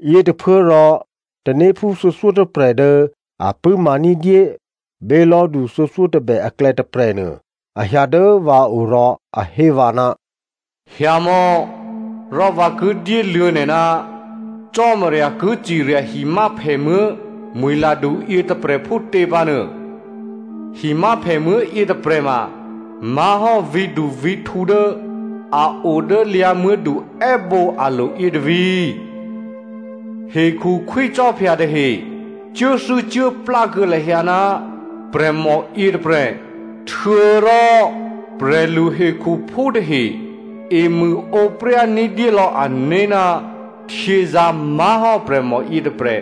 Yětôphuốrò tanéphú thuô̌thyótôprè̤ dố a pṳ̂́ma ní̤dyé bělò̤́du thuô̌thyótôbè aklè̌ tôprè̤nuô, a hyǎ dố vǎ o rò a hé vǎ, “Hyǎmò̌ rò vǎ ki dyéluô̌ nè̤ ná Cò́marya ki cirya himyáphèmuố̤ mwi̤ladu yětôprè̤ phútě pǎ nuô. Himyáphèmuố̤ yětôprè̤ ma má̤hò́ vǐ̤duvǐ̤htǔ dố a o dố lyǎ̤muố̤du è́bǒ alo̤ yětôvǐ̤. Hekhu khwícò́phya tahe cuốthû́cuốplá kuô̌ lahyǎ ná prè̤mò yětôprè̤. Htuô̌rò prè̤lu hekhuphú tahe emṳ̂ǒpryá ní̤dyélò̌ ané̤ ná htyězǎ̤ má̤hò́ prè̤mò yětôprè̤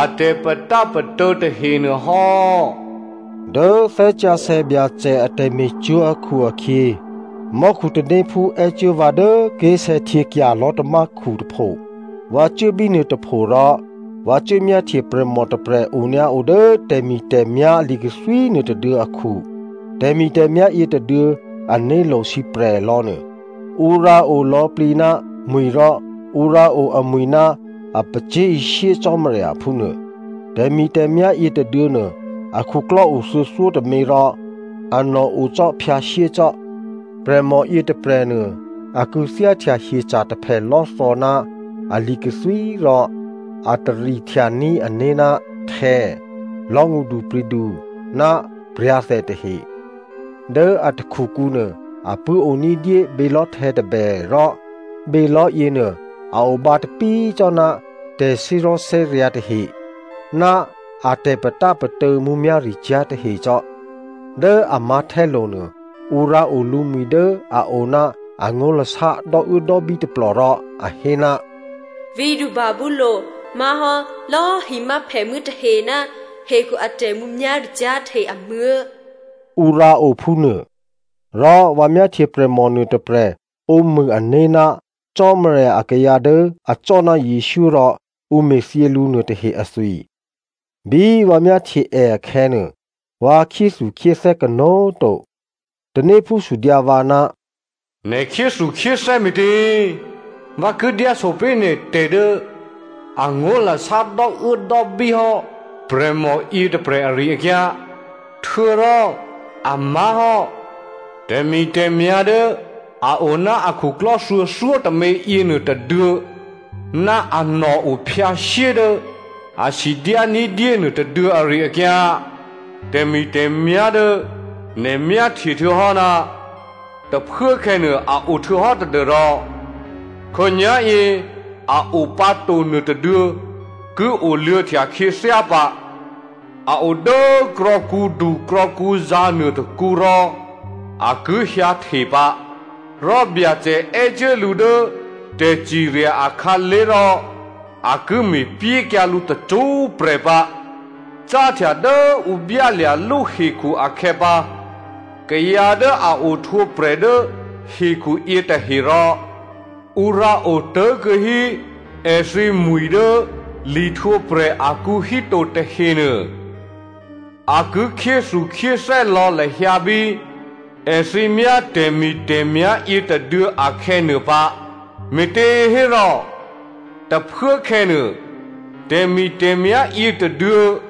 a tè̤patápatô̌ tahenuô hò́.” Dố Thè́ Sǎsè̌ Byacè a tè̤me̤cwó̤ akhu-akhyě, mò́khu tanéphú è́cuố vǎ dố ké̤sè̌htyěkya̤ lò̤́tamákhu tôpho. Vǎ cuố bínuô tôpho rò vǎ cuốmyáhtye prè̤mò tôprè̤ onyǎo dố tè̤mi̤tè̤myá̤ li̤kathwí nuôtôduô̌ akhu. Tè̤mi̤tè̤myá̤ yětôduô̌ ané̤lo̤ sǐprè̤ lò̌nuô, ǔ rǎ o lò̌plǐ ná mwi̤ rò ǔ rǎ o amwi̤ ná a pacyé̤ishyé Cò́marya phúnuô. Tè̤mi̤tè̤myá̤ yětôduô̌ nuô, akhuklò́ o thuô̌thyótômě rò anò̤ o cò́ phyǎshyé cò́. Prè̤mò yětôprè̤nuô a kû̌thyáhtya hyeca̤ taphèlò́thò̌ ná ali̤ kathwí rò a tarihtyaní̤ ané̤ ná htè̌, lò̤́ ngṳdupri̤du ná pra̤thè tahe. Dố a takhukǔ nuô, a pṳ̂́ o ní̤dyé bělò̤́htè̌ tôbè rò bělò̤́ yěnuô a o bǎtapí cò́ ná tè̤thè́zò̤́thè́ryǎ̤ tahe ná a tè̤patápatô̌ mǔmyá̤ricyá̤ tahe cò́. Dố a mǎ̤htè́lo̤ nuô, ǔ rǎo lǔmwi̤ dố a o ná angó̤lasá dò́uốdò́bí tôplò rò a hé, “Vǐ̤du Babylonia Má̤hò́ lò̌꤮ himyáphèmuố̤ tahe Ná hekhu a tè̤mǔmyá̤ricyá̤ tahe amuố̤,” Ǔ rǎo phúnuô. Rò vǎ myáhtye prè̤mò nuôtôprè̤ ǒmṳ̂ ané̤ ná Cò́marya akayǎ dố acò́ ná Jesǔ rò ǔ me̤thyě lǔ nuôtahe athwi. Bí vǎ myáhtye è akhè̌nuô, vǎ khyéthukhyéthè́ kanó̤꤮ to. Tanéphú sudyǎ vǎ, “Nè̤ khyéthukhyéthè́ me̤tě?” Vǎ ki dyáso pé̤ nè̤ tè̤ dố angó̤lasá dò́uốdò́bí hò́ prè̤mò yětôprè̤ ari-akyǎ, htuô̌rò a má̤hò́ tè̤mi̤tè̤myá̤ dố a o ná akhuklò́ thuô̌thyótômě yěnuô tôduô̌ ná anò̤ o phyǎshyé dố a sidyá ní̤dyé nuô tôduô̌ ari-akyǎ. Tè̤mi̤tè̤myá̤ dố nè̤ myáhtye htuô̌hò́ ná tôphuốkhè̌nuô a o htuô̌hò́ tadû́rò khǒnyá̤yě a o pǎ to nuôtôduô̌ ki oluô̌htya khyěthyá pǎ. A o dố krò̌kǔdu krò̌kǔzǎ̤ nuôtôkǔ rò a ki hyǎhte pǎ. Rò Byacè è́cuố lǔ dố tè̤cirya akhǎlé̤ rò a ki me̤pyékyǎ lǔ tacṳ́prè̤ pǎ. Cáhtya dố ǔ byálya̤lú hekhu akhè̌pǎ, kayǎ dố a ohtwǒprè̤ dố hekhu yětahe rò ǔ rǎotố̤kuô̌ hí èthǐmwi̤ dố lihtwǒprè̤ akǔ híto tahenuô, a ki khyéthukhyéthè́ lò̌ lahyǎ bí èthǐ myá tè̤mi̤tè̤myá̤ yětôduô̌ akhè̌ nuô pǎ, me̤těhérò, tôphuốkhè̌ nuô tè̤mi̤tè̤myá̤ yětôduô̌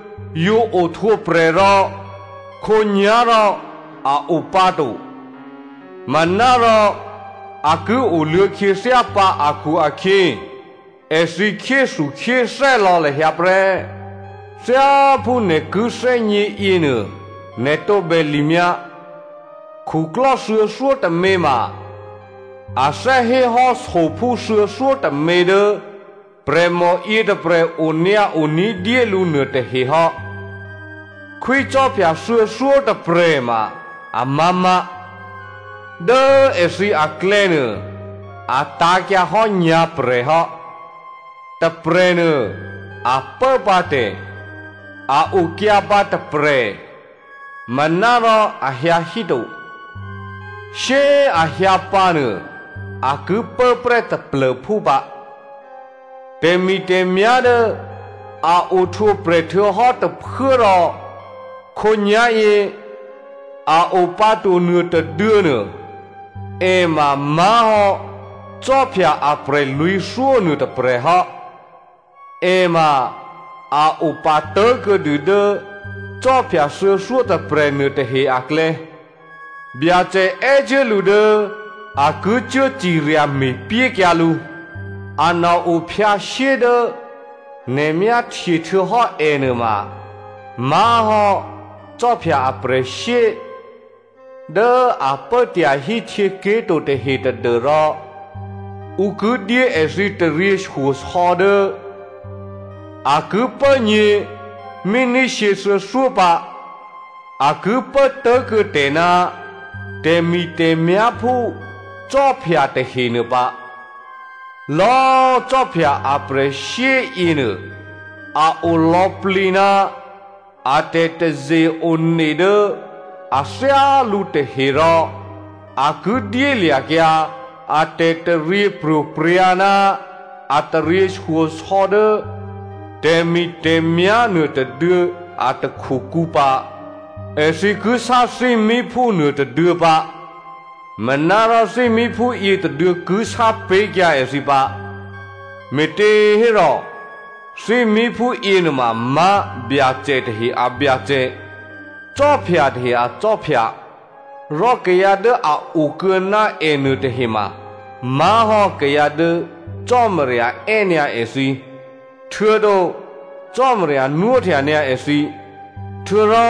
yǒ ohtwǒprè̤ rò khǒnyá̤ rò a o pǎ to, manárò a ki oluô̌ khyěthyá pǎ akhu-akhyě èthǐ khyéthukhyéthè́ lò̌ lahyǎ prè́. Thyáphú nè̤ ki thè́gně yěnuô, nè̤ tǒbè limyǎ. Khuklò́ thuô̌thyótômě ma a thè́ hé hò́ sophú thuô̌thyótômě dố prè̤mò yětôprè̤ onyǎo ní̤dyé lǔ nuôtahe hò́. Khwícò́phya thuô̌thyótôprè̤꤮ ma amá̤má̤. Dố èthǐ aklè̌nuô a tǎ̤kyǎhò́ nyǎ̤prè̤ hò́. Tôprè̤nuô a pốpǎ tè̤, a okyǎpǎ tôprè̤, manárò a hyǎ híto, shyé꤮ a hyǎ pǎ nuô a ki pốprè́ taplô̤phú pǎ. Tè̤mi̤tè̤myá̤ dố a ohtwǒprè̤ htuô̌hò́ tôphuố rò khǒnyá̤yě a o pǎ to nuôtôduô̌nuô, è ma má̤hò́ khwí aprè̤lwǐ̤thyó nuôtôprè̤ hò́. È ma a opatố̤ kuô̌dû dố khwí thuô̌thyótôprè̤ nuôtahe aklè̌. Byacè è́cuố lǔ dố a ki cuố cirya me̤pyékyǎ lǔ. Anò̤ o phyǎshyé dố nè̤ myáhtye htuô̌hò́ ènuô ma má̤hò́ khwí aprè̤shyé dố a pố tyahí htyěké̤ to tahe tadû́rò ǔ ki dyé èthǐ taryěshyosò̌ dố a ki pố nyě̤ míní shyěthuô̌thyó pǎ. A ki pố tố̤kuô̌ tè̤ ná tè̤mi̤tè̤myá̤ phú khwí tahenuô pǎ. Lò̌꤮ khwí aprè̤shyé yěnuô, a o lò̌plǐ ná a tè̤taze-one dố a thyálǔ tahe rò a ki dyélya̤kyǎ a tè̤taryěpro̤prya̤ ná a taryěshyosò̌ dố tè̤mi̤tè̤myá̤ nuôtôduô̌ a takhukǔ pǎ. Èthǐ ki sá thímíphú nuôtôduô̌ pǎ, manárò thímíphú yětôduô̌ ki sápé̤kyǎ èthǐ pǎ, me̤těhérò thímíphú yěnuôma má̤ Byacè tahe a Byacè, khwí tahe akhwí, rò kayǎ dố a okuô̌ ná è nuôtahe ma má̤hò́ kayǎ dố Cò́marya è́ nyǎ èthǐ, htuô̌to Cò́marya nwóhtya nyǎ èthǐ, htuô̌rò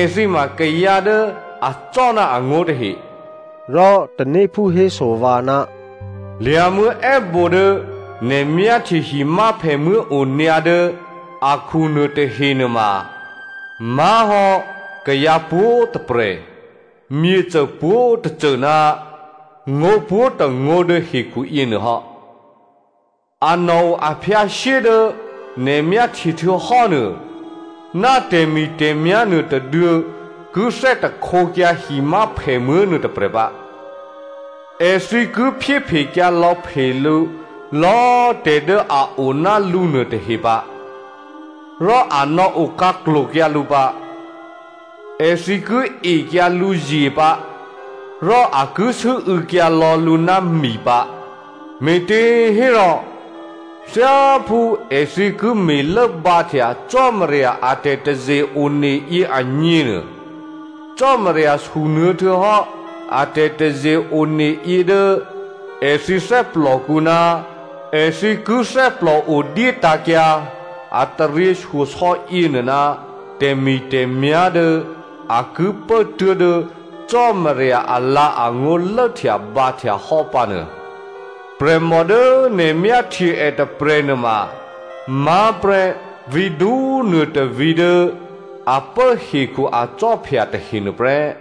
èthǐ ma kayǎ dố acò́ ná angó̤ tahe. Rò tanéphú héso vǎ, “Lyǎ̤muố̤ è́bǒ dố nè̤ myáhtye himyáphèmuố̤ onyǎ dố akhu nuô tahe nuôma má̤hò́ kayǎ pwǒ̤꤮ tôprè̤, myěcô pwǒ̤tôcô, ná ngó̤ pwǒ̤tôngó̤ dố hekhu yěnuôhò́. Anò̤ o aphyǎshyé dố nè̤ myáhtye htuô̌hò́ nuô ná tè̤mi̤tè̤myá̤ nuôtôduô̌ ki thè́htekyǎ himyáphèmuố̤ nuôtôprè̤ pǎ. Èthǐ ki phyéphekyǎ lò̌phe lǔ lò̌꤮ tè̤ dố a o ná lǔ nuôtahe pǎ, rò a nò̌ okhǎklo̤kyǎ lǔ pǎ. Èthǐ ki ekyǎ lǔzye pǎ, rò a ki sû́û̌kyǎ lò̌ lǔ ná mi pǎ. Me̤těhérò thyáphú èthǐ ki me̤lốbǎhtya Cò́marya a tè̤taze-one yě agněnuô, Cò́marya sunuô̌ htuô̌hò́ a tè̤taze-one yě dố èthǐ thè́plòkǔ ná èthǐ ki thè́plòo dyétǎ̤kyǎ a taryěshyosò̌ yěnuô ná tè̤mi̤tè̤myá̤ dố a ki pố tuố̤dố Cò́marya alǎ̤angó̤ lốhtyabǎhtya hò́ pǎnuô. Prè̤mò dố nè̤ myáhtye è tôprè̤nuô ma má̤ prè́ vǐ̤du꤮ nuôtôvǐ̤ dố a pố hekhu akhwí tahe nuôprè́.”